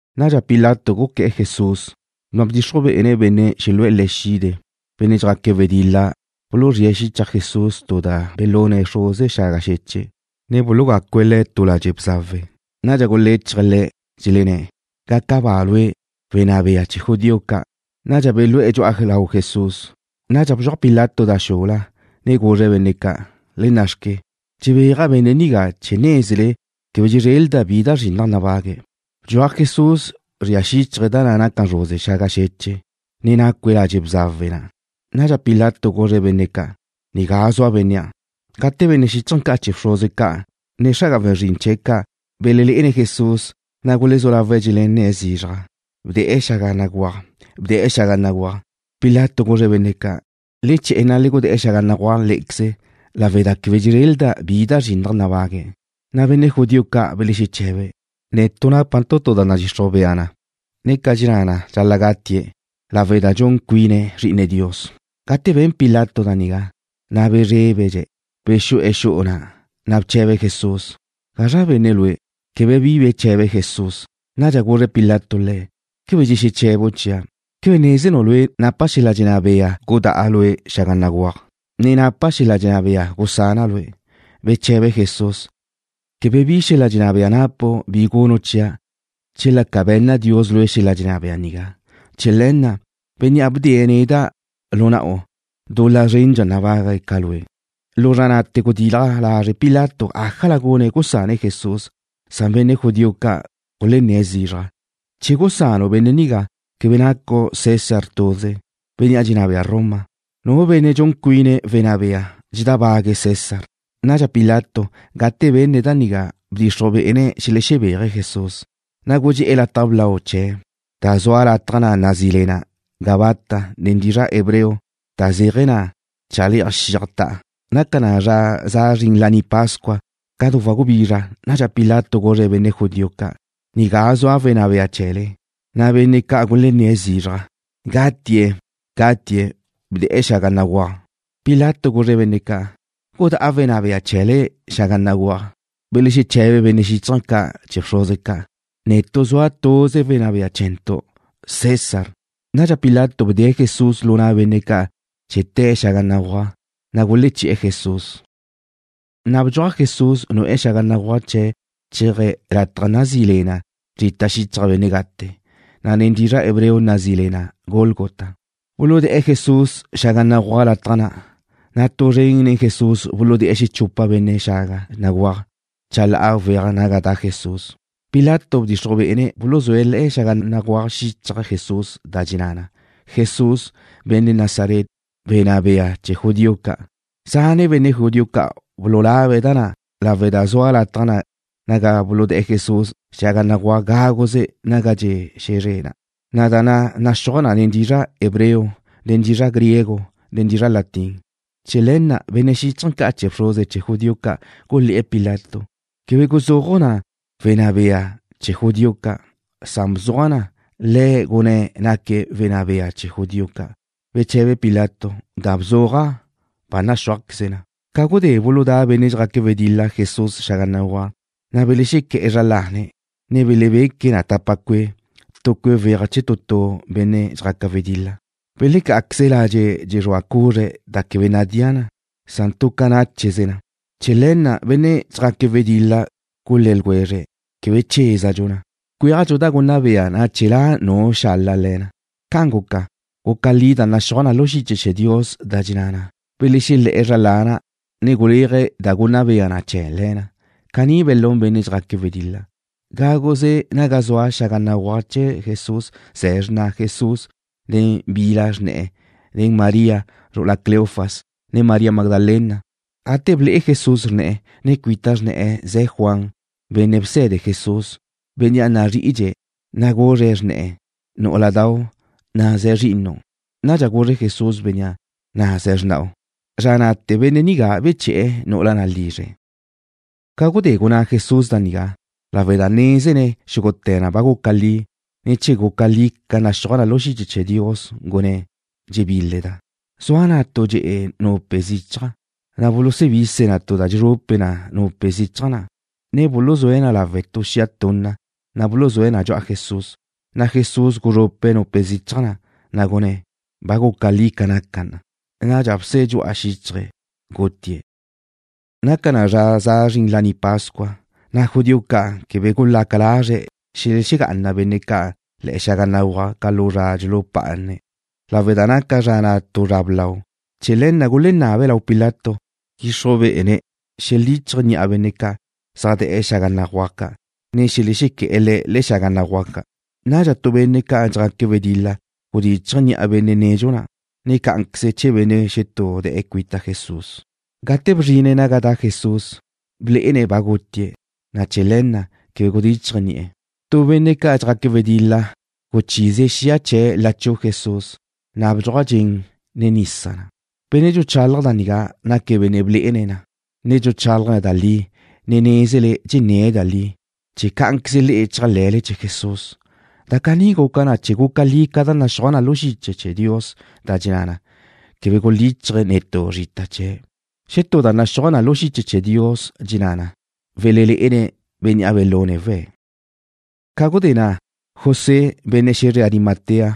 Nadxa Pilato guqué̱'e̱ Jesús, na' bdxixruj bé'ene̱' xelu'e̱ Le̱' xide'. Benne' dxjaque̱' wedil-la buluzríe̱' xichaj Jesús tu da' belune̱' zruze xaga xeche', ne bulugácue̱' Le̱' tu ladxe' bzawe. Nadxa guléchaje̱' Le̱', dxelenné̱': ―¡Gaca ba lue', wenná bea chee̱ judío ca'! Nadxa belú'e̱ dxu'a lau Jesús. Nadxa bdxuaj Pilato da xula, ne guzre̱' benne' ca': ―¡Le nna'xque! Dxebéaja' benne' nigá chee̱ nézele quebe dxezrelda' bi da zrinnaj nabague̱'. Bdxuaj Jesús zria xíchaje̱' da naca zruze xaga xeche', ne nacue̱' ladxe' bzawe na'. Nadxa Pilato guzre̱' benne' ca': ―Nigá zua bénnea'. Gate benne' xíchaje̱ ca' chee̱ bxruze ca', ne xra'aga we̱n zrin chee̱' ca' belelé'ene̱' Jesús, na' gulezú lawe̱' dxelenné̱' zizraj: ―¡Bde̱'e̱ xaga béguaj! ¡Bde̱'e̱ xaga béguaj! Pilato guzre̱' benne' ca': ―Le che̱'e̱, ne le gudé̱'e̱ xaga béguaj lé'equeze, lawe' da quebe dxezrelda' bi da zrinnaj nabague̱'. Na' benne' judío ca' belexeche̱be̱': ―Netu' nápantu' tu da nadxixruj bea na, ne ca dxenná na dxal-la' gatie̱' lawe' da dxun cuine̱' Zri'ine Dios. Gate ben Pilato da nigá, na' bezrébedxe̱'. Bexu'e̱ xu'u na', na' bche̱be̱' Jesús: ―¿Gazra benne' Lue'? Quebe bi beche̱be Jesús. Nadxa guzre Pilato Le̱': ―¿Quebe dxexeche̱bu' chia'? ¿Quebe nézenu' Lue' napa' neda' xel-la' dxenná bea gudá'a Lue' xaga béguaj, ne napa' xel-la' dxenná bea gusana' Lue'? Beche̱be Jesús: ―Quebe bi xel-la' dxenná bea napu' bi gunu' chia' chela ca be̱nna Dios lue' xel-la' dxenná bea nigá. Chee̱ le̱ na', bénnea' bdee̱' neda' lu na'u dul-la zrendxa nabague̱' ca lue'. Lu zra na'te̱ gudilaj lazre' Pilato ájala gune̱' gusane̱' Jesús, san benne' judío ca' gulenné̱' zizraj: ―Che gusanu' benne' nigá, quebe nacu' César tuze, bénnea' dxenná bea Roma. Nu benne' dxun cuine̱' wenná bea dxedábague̱' César. Nadxa Pilato, gate benne̱' da nigá, bdxixruj bé'ene̱' xelexebéaje̱' Jesús, na' gudxé'e̱ lataj blau chee̱', da zua lataj na' nazí le na Gabata nen dizra' hebreo, da zéaje̱ na chale'aj xiaj ta'a. Naca na zra za zrin Laní Pascua, ca du wagubizra. Nadxa Pilato guzre̱' benne' judío ca': ―Nigá zua wenná bea chee̱le. Na' benne' ca' gulenné̱' zizraj: ―¡Gatie̱'! ¡Gatie̱'! ¡Bde̱'e̱ xaga béguaj! Pilato guzre̱' benne' ca': ―¿Gudá'a wenná bea chee̱le xaga béguaj? Belexeche̱be benne' xíchaje̱ ca' chee̱ bxruze ca': ―Netu' zua tuze wenná bea chee̱ntu'. ¡César! Nadxa Pilato bdee̱' Jesús lu na' benne' ca' chee̱ te̱'e̱ xaga béguaj, na' guleché̱'e̱ Jesús. Na' bdxuaj Jesús nu'e̱ xaga béguaj chee̱ chéaje̱' lataj na' nazí le na Zrita Xichaj Benne' Gate, na' nen dizra' hebreo nazí le na Gólgota. Buludé̱'e̱ Jesús xaga béguaj lataj na', na' tu zren nen Jesús buludé̱'e̱ xechupa benne' xaga béguaj ca' chalá'a weaj naga da' Jesús. Pilato bdxixruj bé'ene̱' buluzúe̱' le̱'e xaga béguaj xichaj Jesús da dxenná na: Jesús, Benne' Nazaret, Wenná Bea Chee̱ Judío Ca'. Zane' benne' judío ca' bululabe̱' da na' lawe' da zua lataj na' naga buludé̱'e̱ Jesús xaga béguaj gáguze naga dxe' xe̱zre na', na' da na' naxúaj na nen dizra' hebreo, ne nen dizra' griego, ne nen dizra' latín. Chee̱ le̱ na' benne' xíchaje̱ ca' chee̱ bxruze chee̱ judío ca' gulé̱'e̱ Pilato: ―Quebe guzúaju' na: Wenná Bea Chee̱ Judío Ca'. Bzuaj na: Le̱' Gunné̱' Naque̱' Wenná Bea Chee̱ Judío Ca'. Beche̱be Pilato: ―Da bzuaja', ba naxúajqueze na. Ca gudé buludá' benne' dxjaque̱' wedil-la Jesús xaga béguaj, na' belexequé̱'e̱ zra lane̱', ne belebeque̱' na tapa cue', tu cue' weaj chee̱ tu tu benne' dxjaque̱' wedil-la. Belecá'aqueze̱' ladxe' dxexrúa cuzre̱' da quebe nadía na. Tu ca nácheze na. Chee̱ le̱ na' benne' dxjaque̱' wedil-la gulé̱ ljwezre̱': ―Quebe chézadxu na. Cwéajdxu da gunna bea na chee̱ la' nu xala le̱ na. Ca'an guca, guca li da naxúaj na lu xiche chee̱ Dios, da dxenná na: Belexelé̱'e̱ zra lana', ne guléaje̱' da gunna bea na chee̱ le̱ na. Caní belún benne' dxjaque̱' wedil-la. Gáguze naga zua xaga béguaj chee̱ Jesús ze̱ xrna Jesús nen bi bila xrne̱'e̱, ne María, zru'ula Cleofas, ne María Magdalena. Gate ble'e Jesús xrne̱'e̱, ne cuita xrne̱'e̱ na' ze̱ Juan, benne' bse̱de Jesús, bénnea' nazri'idxe̱', na' guzre̱' xrne̱'e̱: ―Nú'uladau', na' ze̱ zri'inu'. Nadxa guzre Jesús bénnea': ―Na' ze̱ xrna'u. Zra na'te̱ benne' nigá beche̱'e̱ nu'ula na' lizre̱'. Ca gudé gunná Jesús da nigá, lawe' da nézene̱' xúgute̱ na ba guca li, ne chee̱ guca li ca naxúaj na lu xiche chee̱ Dios, gunné̱': ―Dxebíleda'. Zua na' tu dxe'e nupe zichaj, na' bulusubise̱' tu da dxezrupe na nupe zichaj na', ne buluzúe̱' na lawe' tu xia tunna, na' buluzúe̱' na dxu'a Jesús. Na' Jesús guzrupe̱' nupe zichaj na', na' gunné̱': ―Ba guca li ca naca na. Nadxa bse dxu'a xíchaje̱', gutie̱'. Naca na zra za zrin Laní Pascua, na' judío ca' quebe gulaca lazre̱' xelexegá'ana benne' ca' le̱'e̱ xaga béguaj ca' lu zra dxulupá'ane̱' lawe' da naca zra na' tu zra blau. Chee̱ le̱ na' gulenabe̱' lau Pilato dxixruj bé'ene̱' xelíchaje̱' ni'a benne' ca' zaj de̱'e̱ xaga béguaj ca', ne xelexequé̱'e̱ le̱' le̱'e̱ xaga béguaj ca'. Nadxa tu benne' ca' dxjaque̱' wedil-la gudíchaje̱' ni'a benne' nedxu na', ne cá'anqueze chee̱ benne' xetú de̱'e̱ cuita Jesús. Gate bzrine̱' naga da' Jesús, blé'ene̱' ba gutie̱', na' chee̱ le̱ na' quebe gudíchaje̱' ni'e̱. Tu benne' ca' dxjaque̱' wedil-la guchízie̱' xia chee̱' lachú'u Jesús, na' bdxuaj dxen, ne nisa na'. Benne' dxuchalaj da nigá naque̱' benne' blé'ene̱' na, ne dxuchálaje̱' da li, ne nézene̱' dxenné̱' da li, chee̱ cá'anqueze le'e chéajle̱le chee̱ Jesús. Da caní guca na chee̱ guca li ca da naxúaj na lu xiche chee̱ Dios, da dxenná na: Quebe gulíchaje̱' netú zrita chee̱'. Xetú da naxúaj na lu xiche chee̱ Dios dxenná na: Welelé'ene̱' bénnea' belune̱' we̱'. Ca gudé na' José, benne' xe̱zre Arimatea,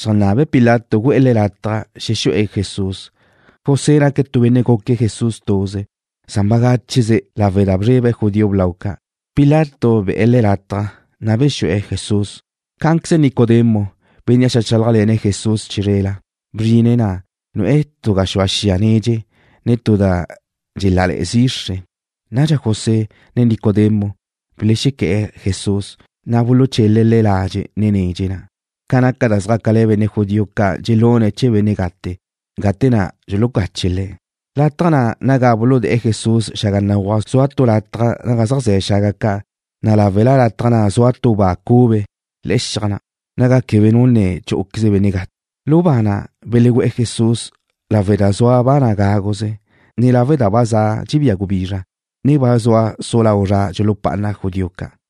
xeajnabe̱' Pilato gu'e̱ le̱' lataj xexu'e̱ Jesús. José naque̱' tu benne' guque̱' Jesús tuze, san bagácheze lawe' da bzrebe̱' judío blau ca'. Pilato be̱'e̱ le̱' lataj, na' bexu'e̱ Jesús. Cá'anqueze Nicodemo, bénnea' xeajchálajle̱ne̱' Jesús chizrela, bzrine̱' na', nu'e̱ tu gaxúa xiaj nedxe, ne tu da dxelále̱'e̱ zixre. Nadxa José, ne Nicodemo belexequé̱'e̱ Jesús, na' buluchele̱' Le̱' ladxe' nen nedxe na' ca naca da zjácale̱ benne' judío ca' da dxelune̱' chee̱ benne' gate', gate na' dxulucache̱' le̱'. Lataj na' naga buludé̱'e̱ Jesús xaga béguaj zua tu lataj naga zaj ze̱ xaga ca', na' láwela lataj na' zua tu ba cube le̱'e̱ xiaj na', naga quebe nu ne chú'uqueze benne' gate'. Lu ba na' belegu'e̱ Jesús lawe' da zua ba na' gáguze, ne lawe' da ba dxebía gubizra, ne ba zua su lau zra dxulupá'ana judío ca'.